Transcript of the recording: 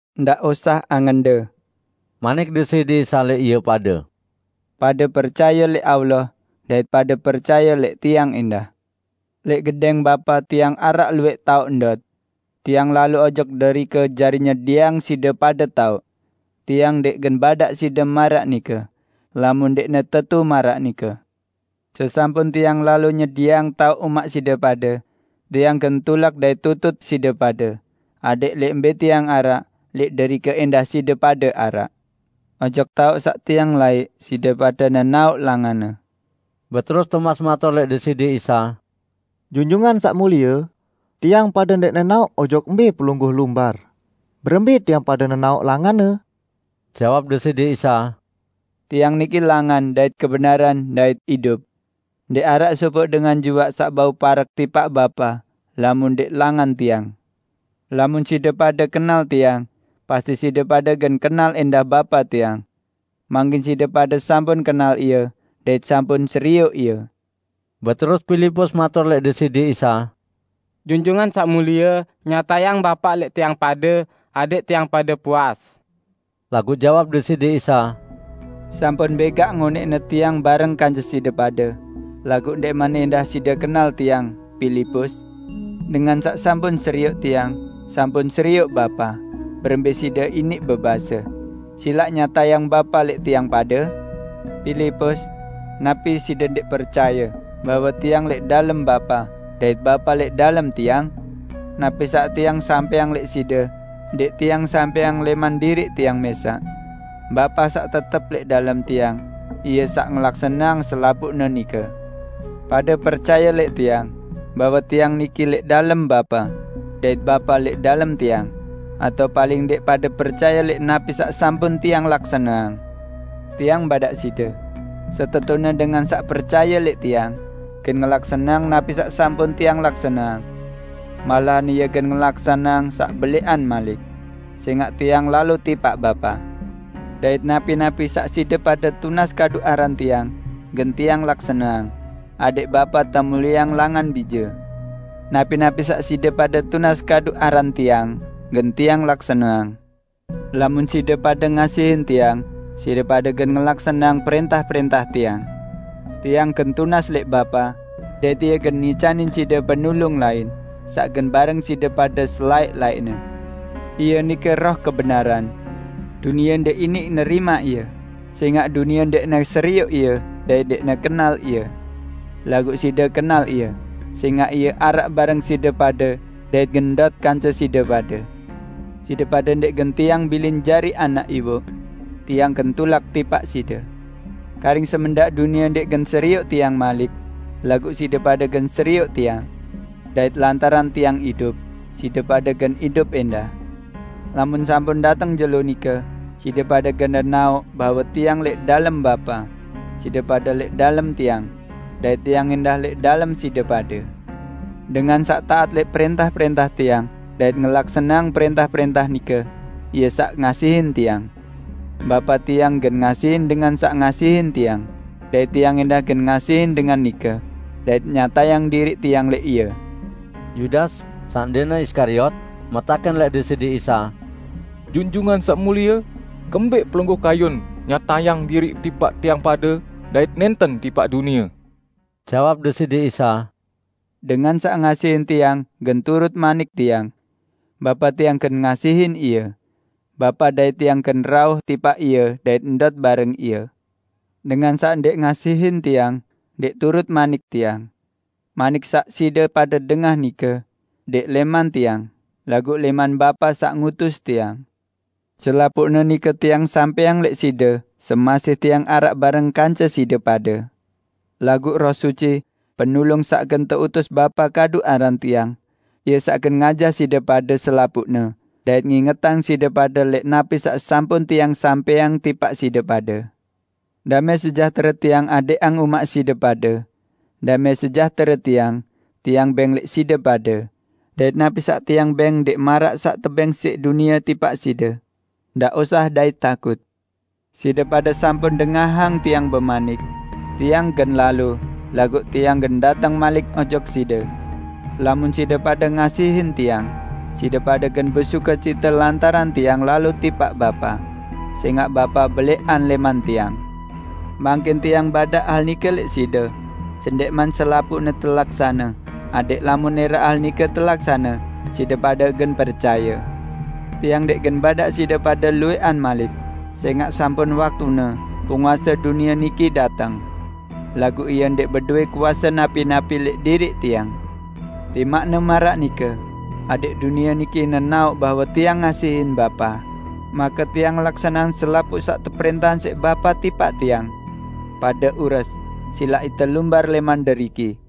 "Ndaq osah angende," manik Deside Isa lẽq ie pade. "Pade percaye lẽq Allah dait pade percaye lẽq Tiang ẽndah. Lẽq gedẽng Bapa Tiang araq luwẽq taoq ndot. Tiang lalo ojok derike jari nyedieang side pade taoq. Tiang ndẽq gen badaq side maraq nike, lamun ndẽqne tetu maraq nike. Sesampun Tiang lalo nyedieang taoq umaq side pade, Tiang gen tulak dait tutut side pade, adẽq lẽq mbẽ Tiang araq, lẽq derike ẽndah side pade araq. Ojok taoq saq Tiang laiq side pade nenaoq langanne." Beterus Tomas matur lẽq Deside Isa, "Junjungan Saq Mulie, tiang pade ndẽq nenaoq ojok mbẽ Pelungguh lumbar, berembẽ tiang pade nenaoq langanne?" Jawab Deside Isa, "Tiang niki langan dait kebenaran dait idup. Ndẽq araq sopoq dengan juaq saq bau parek tipaq Bapa lamun ndẽq langan Tiang. Lamun side pade kenal Tiang, pasti side pade gen kenal ẽndah Bapa Tiang. Mangkin side pade sampun kenal Ie, dait sampun serioq Ie!" Beterus Pilipus matur lẽq Deside Isa, "Junjungan Saq Mulie, nyatayang Bapa lẽq tiang pade, adẽq tiang pade puas." Laguq jawab Deside Isa, "Sampun bẽgaq ngonẽqne Tiang bareng kance side pade, laguq ndẽqman ẽndah side kenal Tiang, Pilipus? Dengan saq sampun serioq Tiang, sampun serioq Bapa, berembẽ side iniq bebase, 'Silaq nyatayang Bapa lẽq tiang pade'? Pilipus! Napi side ndẽq percaye, bahwe Tiang lẽq dalem Bapa, dait Bapa lẽq dalem Tiang? Napi saq Tiang sampẽang lẽq side, ndẽq Tiang sampẽang lẽman diriq Tiang mẽsaq. Bapa saq tetep lẽq dalem Tiang, Ie saq ngelaksaneang selapuqne nike. Pade percaye lẽq Tiang, bahwe Tiang niki lẽq dalem Bapa, dait Bapa lẽq dalem Tiang, atao paling ndẽq pade percaye lẽq napi saq sampun Tiang laksaneang. Tiang badaq side: Setetune dengan saq percaye lẽq Tiang, gen ngelaksaneang napi saq sampun Tiang laksaneang -- malahan ie gen ngelaksaneang saq belẽqan malik -- sẽngaq Tiang lalo tipaq Bapa. Dait napi-napi saq side pade tunas kadu aran Tiang, gen Tiang laksaneang, adẽq Bapa temulieang langan Bije. Napi-napi saq side pade tunas kadu aran Tiang, gen Tiang laksaneang." "Lamun side pade ngasihin Tiang, side pade gen ngelaksaneang prẽntah-prẽntah Tiang. Tiang gen tunas lẽq Bapa, dait Ie gen ngicanin side Penulung lain, saq gen bareng side pade selaẽq-laẽqne. Ie nike Roh Kebenaran. Dunie ndẽq iniq nerimaq Ie, sẽngaq dunie ndẽqne serioq Ie dait ndẽqne kenal Ie. Laguq side kenal Ie, sẽngaq Ie araq bareng side pade dait gen ndot kance side pade. Side pade ndẽq gen Tiang bilin jari anak iwoq. Tiang gen tulak tipaq side. Karing semendaq dunie ndẽq gen serioq Tiang malik. Laguq side pade gen serioq Tiang. Dait lantaran Tiang idup, side pade gen idup ẽndah. Lamun sampun dateng jelo nike, side pade gen nenaoq bahwe Tiang lẽq dalem Bapa, side pade lẽq dalem Tiang, dait Tiang ẽndah lẽq dalem side pade. Dengan saq taat lẽq prẽntah-prẽntah Tiang dait ngelaksaneang prẽntah-prẽntah nike, ie saq ngasihin Tiang. Bapa Tiang gen ngasihin dengan saq ngasihin Tiang, dait Tiang ẽndah gen ngasihin dengan nike, dait nyatayang diriq Tiang lẽq ie." Yudas (saq ndẽqne Iskariot) metakẽn lẽq Deside Isa, "Junjungan Saq Mulie, kembẽq Pelungguh kayun nyatayang diriq tipaq tiang pade dait nẽnten tipaq dunie?" Jawab Deside Isa, "Dengan saq ngasihin Tiang, gen turut manik Tiang. Bapa Tiang gen ngasihin ie. Bapa dait Tiang gen rauh tipaq ie dait ndot bareng ie. Dengan saq ndẽq ngasihin Tiang, ndẽq turut manik Tiang. Manik saq side pade dengah nike, ndẽq lẽman Tiang, laguq lẽman Bapa saq ngutus Tiang. Selapuqne nike Tiang sampẽang lẽq side semasih Tiang araq bareng kance side pade. Laguq Roh Suci, Penulung saq gen teutus Bapa kadu aran Tiang, Ie saq gen ngajah side pade selapuqne dait ngingetang side pade lẽq napi saq sampun Tiang sampẽang tipaq side pade. Damẽ sejahtere Tiang adẽqang umaq side pade. Damẽ sejahtere Tiang, Tiang bẽng lẽq side pade, dait napi saq Tiang bẽng ndẽq maraq saq tebẽng siq dunie tipaq side. Ndaq osah dait takut. Side pade sampun dengahang Tiang bemanik, 'Tiang gen lalo, laguq Tiang gen dateng malik ojok side.' Lamun side pade ngasihin Tiang, side pade gen besukecite lantaran Tiang lalo tipaq Bapa, sẽngaq Bapa belẽqan lẽman Tiang. Mangkin Tiang badaq hal nike lẽq side, sendẽqman selapuqne telaksane, adẽq lamun ẽraq hal nike telaksane, side pade gen percaye. Tiang ndẽq gen badaq side padu luwẽqan malik, sẽngaq sampun waktune penguase dunie niki dateng. Laguq ie ndẽq bedowẽ kuase napi-napi lẽq diriq Tiang. Timaqne maraq nike, adẽq dunie niki nenaoq bahwe Tiang ngasihin Bapa, make Tiang ngelaksaneang selapuq saq teprẽntahang siq Bapa tipaq Tiang. Pade ures, silaq ite lumbar lẽman deriki."